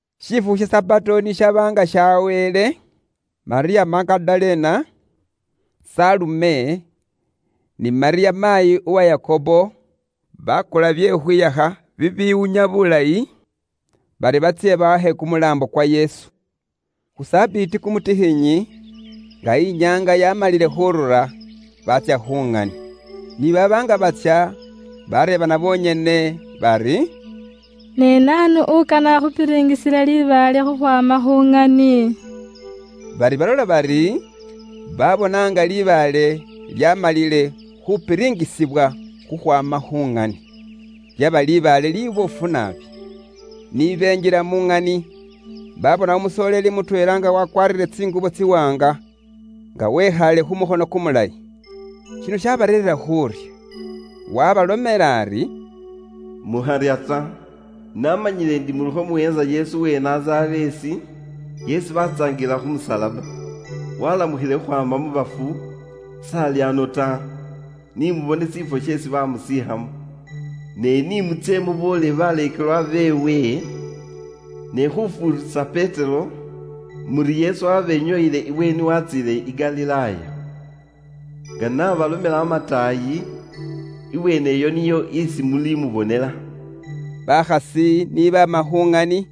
Shifukhu sha Sabato ni shaba nga shaweele, Malyamu Magadalena, Salume, ni Malyamu maayi uwa Yakobo, bakula bye khukhwihakha bibiwunya bulayi, bari batsye bawakhe kumulaambo kwa Yesu. Khu Sabiti kumutikhinyi, nga inyaanga yamalile khurura, baatsya khu ŋani. Ni baaba nga batsya bareebana bonyene bari, “Ne naanu ukane akhupilingisile libaale khukhwaama khu ŋani?” Bari balola bari, babona nga libaale lyamalile khupilingisibwa khukhwaama khu ŋani. Lyaba libaale liboofu naabi. Ni benjila mu ŋani, babona umusoleeli mutweela nga wakwaarire tsingubo tsiwaanga, nga wekhaale khu mukhono kumulayi. Shino shabareerera khuurya. Waabalomela ari, “Mukharya ta. Naamanyile indi mulikho muweentsa Yesu uwe i Nazareesi, isi baatsaangilila khu musalaba. Waalamukhile khukhwaama mu bafu, s'ali ano ta; ni mu bone shifwo sheesi baamusiikhamo. Ne ni mutsye muboolele baleekelwa beewe, ne khufuurisa Petero, muri Yesu waabenyooyile ibweeni waatsiile i Galilaaya. Nga n'abalomela amataayi, ibweene iyo niyo isi mulimubonela.” Bakhasi ni baama khu ŋani,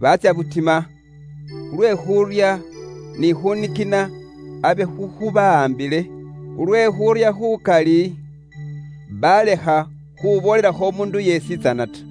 baatsya butima, ilala abe khuurya ni khunikina byaabawaambile. Khulwe khuurya khukali, baalekha khuboolelakho umuundu yeesitsana ta.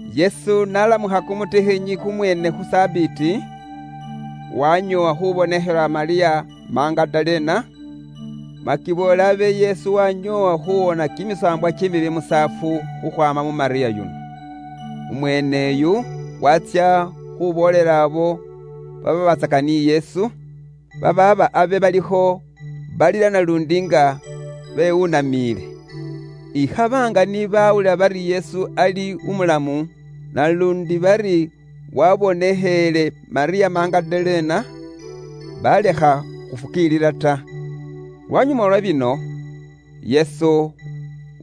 Yesu n'alamukha kumutikhinyi kumweene khu Sabiti, waanyoowa khubonekhela Malyamu Magadalena. Makiboole abe Yesu waanyoowa khuwoona kimisaambwa kimibi musaafu khukhwaama mu Malyamu yuno. Umweene uyu waatsya khuboolela abo babaabatsaka ni Yesu, baaba abe balikho balila naluundi nga bewunamiile. Ikhaba nga ni bawulila bari Yesu ari ali umulamu, naluundi bari wabonekheele Malyamu Magadalena, balekha khufukiilila ta. Lwanyuma lwa bino, Yesu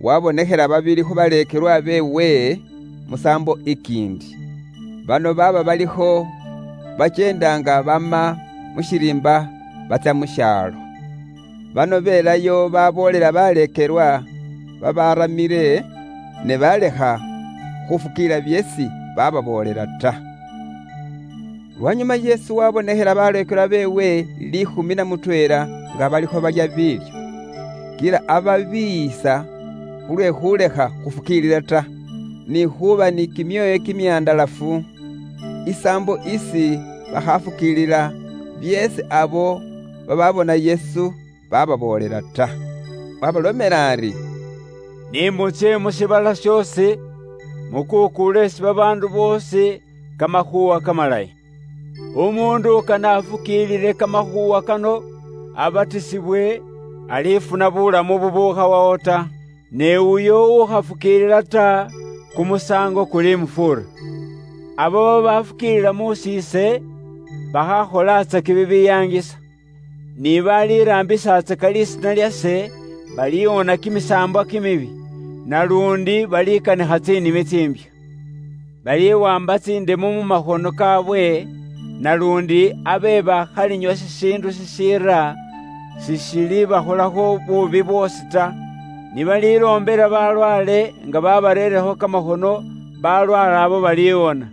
waabonekhela babili khu baleekelwa beewe, musaambo ikiindi. Bano baaba balikho bakyeenda nga baama mu shiriimba batsya mu shaalo. Bano beelayo baboolela baleekelwa babaaramile, ne baalekha khufukiilila byeesi bababoolela ta. Lwanyuma Yesu waabonekhela baleekelwa beewe liikhumi na mutweela nga balikho balya biilyo. Kila ababiiyisa khulwe khulekha khufukiilila ta, ni khuuba ni kimyoyo kimihandalafu, isaambo isi bakhafukiilila byeesi abo bababona Yesu bababoolela ta. Waabalomela ari, “Ni mutsye mu shiibala shoosi, mukuukuule isi babaandu boosi Kamakhuuwa Kamalayi. Umuundu ukane afukiilile Kamakhuuwa kano abatisibwe, alifuna buwonesi; ne uyo ukhafukiilila ta, kumusaango kulimufuura. Abo babaafukiilila muusi ise, bakhaakholatsake bibiyaangisa. Ni baliraambisatsaka lisiina lyase, baliwoona kimisaambwa kimibi, naluundi balikanikha tsinimi tsimbya. Baliwaamba tsindemu mu makhono kaabwe, naluundi abe baakhalinywa shishiindu shishiira, seshilibakholakho buubi bwoosi ta. Ni baliloombela balwaale nga babarakho kamakhono, balwaale abo baliwona.”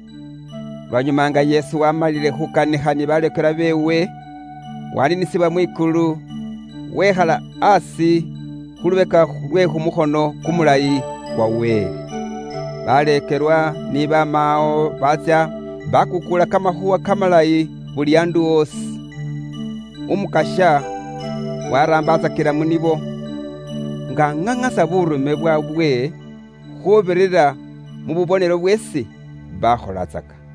Lwanyuma nga Yesu waamalile khukanikha ni baleekelwa beewe, waniinisibwa mwikulu, wekhala aasi khu lubeka lwe kumukhono kumulayi kwa Wele. Baleekelwa ni baama awo baatsya bakuukuula Kamakhuuwa Kamalayi buli andu osi. Umukasya waraambatsakila mu nibo, nga aŋaŋasa buurume bwaabwe khuubirira mu bubonelo bweesi bakholatsaka.